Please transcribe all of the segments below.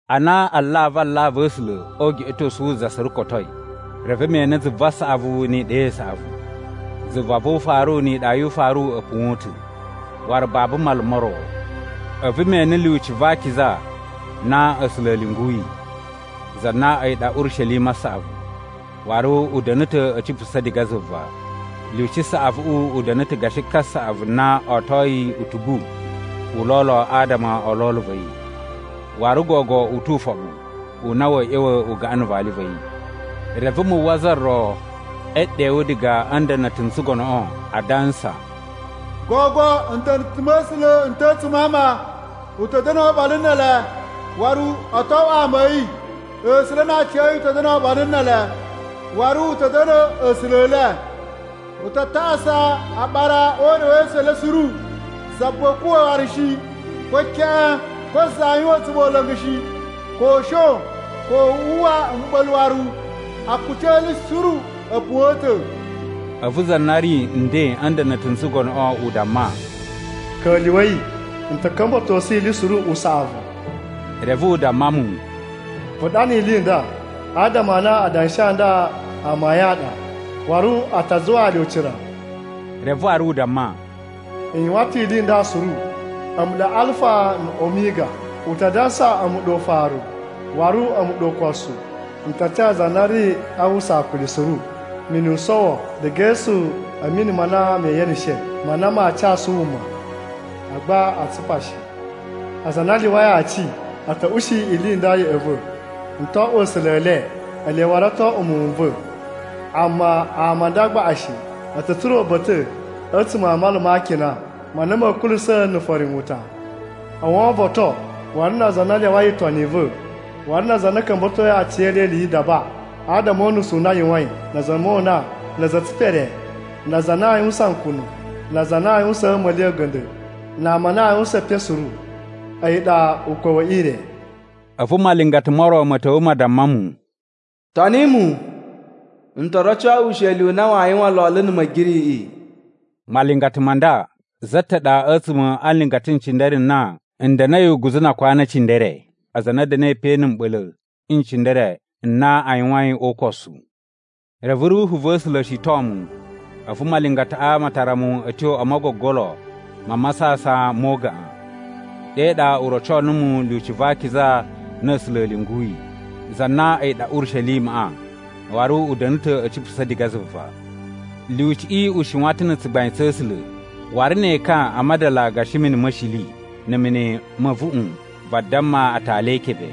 Ana alavu alavu a̱ A̱sula̱ o ugeꞌetosu wu za suru kotoi, reve me ene zuva saꞌavu ni iɗa i saꞌavu. Zuva vu ufaru ni iɗa yu ufaru a̱ puwa̱n ta̱, waru babu mala mo ro. A̱vu me ene Lyuci va Akiza na A̱sula̱ a̱ lyunguyi, za na a̱yi ɗa Urishelima saꞌavu, waru u da̱na̱ ta̱ a̱ cipusa̱ diga zuva. Lyuci saꞌavuꞌu u da̱na̱ ta̱ gashi kasaꞌavu na otoi utugu u lolo adama o lolo va̱ yi, waru gogo u tu ufoɓu u na wa̱a̱ ꞌya̱wa̱ u gaꞌan na̱ vali va̱ yi. Reve, mu uwwa za ro e ɗewu diga a̱ nda̱na̱ta̱ n tsugonoꞌo, adansa, “Gogo nda̱na̱ta̱ ma̱ A̱sula̱ n ta̱ a̱tsuma̱ a ama! U ta̱ da̱nu oɓolo ne ele, waru o to oꞌwo ama a̱ yi. A̱sula̱ na aciya̱yi u ta̱ da̱na̱ oɓolo ne ele, waru u ta̱ da̱na̱ A̱sula̱ e le. U ta tasa aɓara o urewesu u le suru. Za buwa a̱a̱ kuwa̱ waru shi, ko keꞌen. Ko za aa yuwan a̱tsumola̱ngu shi, ko u shon, ko wu uwwa mɓa̱la̱ waru. Akuci e ili suru a̱ puwa̱n ta̱.” A̱vu za na ri nden a̱ nda̱na̱ta̱ n tsugonoꞌo u damma, “Ka̱lyuwa̱i! N ta̱ ka̱mba̱tosu ili suru usaꞌavu!” Reve u damma mu, “Vu ɗana ili i nda, adama a na adanshi a nda amayun a ɗa waru a ta zuwaa le ucira.” Reve waru u damma, “N yuwan ta̱ ili i nda suru! A̱mu ɗa Alfa na̱ Omiga. U ta dansa a̱mu ɗa Ufaru waru a̱mu ɗa Ukosu. N ta ca za na ri a uwwusa akuli suru mini u sowo diga e esu a̱ mini ma na me yeneshe ma na maa casu wuma. Agba aa tsupa shi. Aza a na a lyuwai aci a̱ ta̱ ushi ili i nda ya̱ꞌa̱ va̱: N to oꞌwo A̱sula̱ e le, ele waru o to oꞌwo muwun n va̱. Amma ama a nda gbaꞌa shi a̱ ta̱ tsura̱ uba̱ta̱ a̱tsuma̱ a mala ma akina ma na ma̱ kulusa̱ na̱ farinwuta: Owovoton, waru na aza a na a lyawai itoni i va̱, waru na aza a na a̱ ka̱mba̱toi aciyele ili yi idaba adama o unusu u na a yuwain, na̱ a̱za̱ a̱ mona, na̱ a̱za̱ e tsipere, na aza a na a yuwusan nkunu, na aza a na aa yuwusaan a̱ma̱li a̱ga̱nda̱, na ama a na a yuwusan epen suru. A̱yi ɗa ukwa̱ we ire.” A̱vu malingata mo ro ma̱ ta̱wa̱ ma damma mu, “Toni mu! N to roco wu usheli u na waa yuwan lolo na̱ Ma̱giriꞌiꞌi.” (Malingata ma nda, za ta̱ ɗa a̱tsuma̱ a nlingata n cindere n na n da̱na̱i uguzu na akwanu e cindere aza a na a̱ da̱na̱i pe na̱ mɓa̱la̱ n cindere n na a yuwain o ukosu.) Reve Ruhu va̱ A̱sula̱ shiton mu, a̱vu malingataꞌa ma tara mu a̱ tyo o mogogolo ma masasan mo ugaꞌan. Ɗe ɗa u roco numu Lyuci va Akiza na A̱sula̱ a̱ lyunguyi, za na a̱yi ɗa Urishelimaꞌa, waru u da̱na̱ ta̱ a̱ cipusa̱ diga zuva. Lyuciꞌi u shiwan ta̱ na̱ tsugbain tsa̱ A̱sula̱ waru ne ekan a madala gashi mini ma̱ shili na̱ mini ma̱ a̱vuꞌun vadamma atali e ikebe,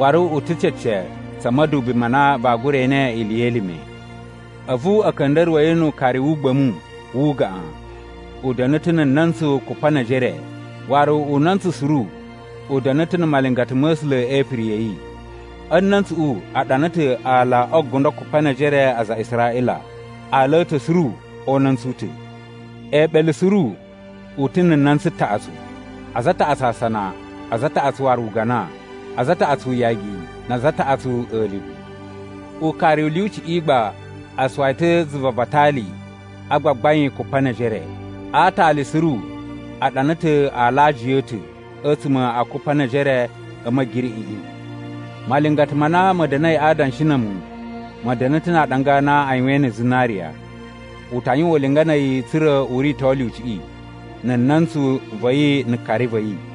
waru u ta̱ cece tsa̱ ma̱dubi ma na vaa gura ene ili ye elime. A̱vu a̱ ka̱nda̱ruwa̱ yi nu ukari wu ugba̱mu wu ugaꞌan. U da̱na̱ ta̱ na̱ na̱ntsu kupa ne ejere waru una̱ntsu suru u da̱na̱ ta̱ na̱ malingata ma̱ A̱sula̱ e ipiri ya̱ yi. A̱ na̱ntsuꞌu a ɗana ta̱ ala o gundo kupa ne ejere a aza a Israꞌila, aala a̱ ta̱ suru o una̱ntsu u ta̱. Eeɓele suru u ta̱ na̱ na̱ntsu taꞌatsu: aza a taꞌatsu asana, aza a taꞌatsu waru ugana, aza a taꞌatsu uyagi, na aza a taꞌatsu a̱livu. Ukari u lyuciꞌi gba a suwa yi ta̱ zuva va atali a gbagbain kupa ne ejere. A aatali suru a ɗana ta̱ aala a aajiya a̱ ta̱ a̱tsuma̱ a kupa ne ejere a̱ Ma̱giriꞌiꞌi. Malingata ma na ma̱ da̱na̱i a adanshi na̱ a̱mu ma̱ da̱na̱ ta̱ na aaɗanga a na a yuwain na̱ zinariya. U ta yuwan ulinga na̱ a̱yi tsa̱ra̱ u rito lyuciꞌi, na̱ na̱ntsu va̱ yi na̱ kari va̱ yi.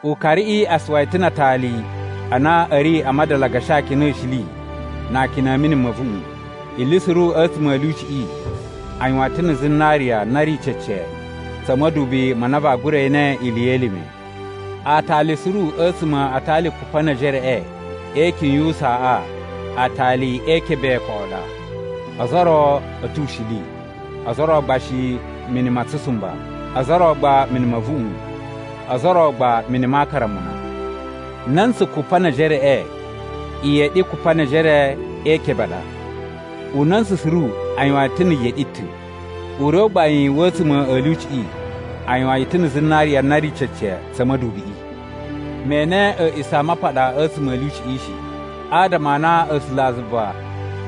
Ukariꞌi a suwa yi ta̱ na atali a na a̱ ri a madala gashi akina a̱ shili na akina a̱ mini ma̱ a̱vuꞌun. Ili suru a̱tsuma̱ a̱ lyuciꞌi a yuwan yi ta̱ na̱ zinariya na ri cece tsa̱ ma̱dubi ma na vaa gura ene ili ye elime. Aatali suru a̱tsuma̱ a atali kupa ne ejereꞌe e ikyun yu usaaꞌa aatali e ikebe koꞌo ɗa. Ozo o ro a̱ ta̱ ushili, ozo o ro gba shi mini ma tsusumba, ozo o ro gba mini ma̱ a̱vuꞌun, ozo o ro gba mini ma akaramuna. Na̱ntsu kupa ne ejereꞌe iyeɗi kupa ne ejere e ikebe a ɗa. Una̱ntsu suru a yuwan yi ta̱ na̱ yeɗi ta̱. Ure u gbain wa̱ a̱tsuma̱ a̱ lyuciꞌi a yuwan yi ta̱ na̱ zinariya na ri cece tsa̱ ma̱dubiꞌi. Me ene A̱a̱ꞌisamapaɗa a̱tsuma̱ a̱ lyuciꞌi shi, adama a na A̱sulazuva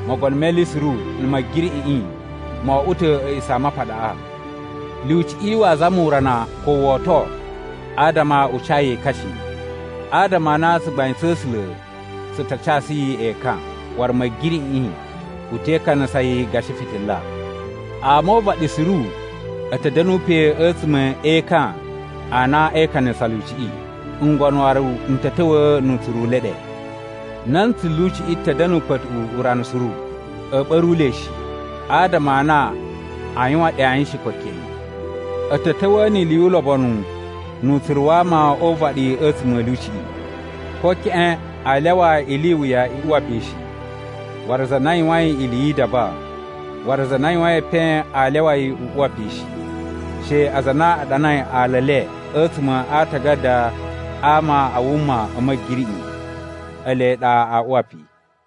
Mogono me Ili Suru na̱ Ma̱giriꞌiꞌi mo oꞌwo ta̱ A̱a̱ꞌisamapaɗaꞌa. Lyuciꞌi waa zama urana ko woto adama u ca yi ekan shi, adama a na tsugbain tsa̱ A̱sula̱ tsu ta casu yi ekan waru Ma̱giriꞌiꞌi u te ikanasa yi gashi fitila. Ama o uvaɗi suru a̱ ta̱ da̱nu pe a̱tsuma̱ e ekan a na e ikanasa lyuciꞌi. Ngono waru n ta̱ ta̱wa̱a̱ nu utsuru u le ɗe. Na̱ntsu lyuciꞌi ta̱ da̱na̱ ukpa̱tuꞌu urana suru. A̱a̱ ɓa̱ru le shi, adama a na aa yuwan ɗe ayin shi, ko keꞌen. A̱ ta̱ ta̱wa̱a̱ ni ili yu ulobonu nu utsuru wa ama o uvaɗi a̱tsuma̱ a̱ lyuciꞌi. Ko keꞌen a lyawa ili i wuya i uwa pe shi, waru za na yuwain ili yi idaba, waru za na yuwain epen aa lyawa yi u uwa pe shi. She aza a na a ɗanai ala e le a̱tsuma̱ a aatagada a ama a wuma a̱ Ma̱giriꞌi ele ɗa aa uwa pe.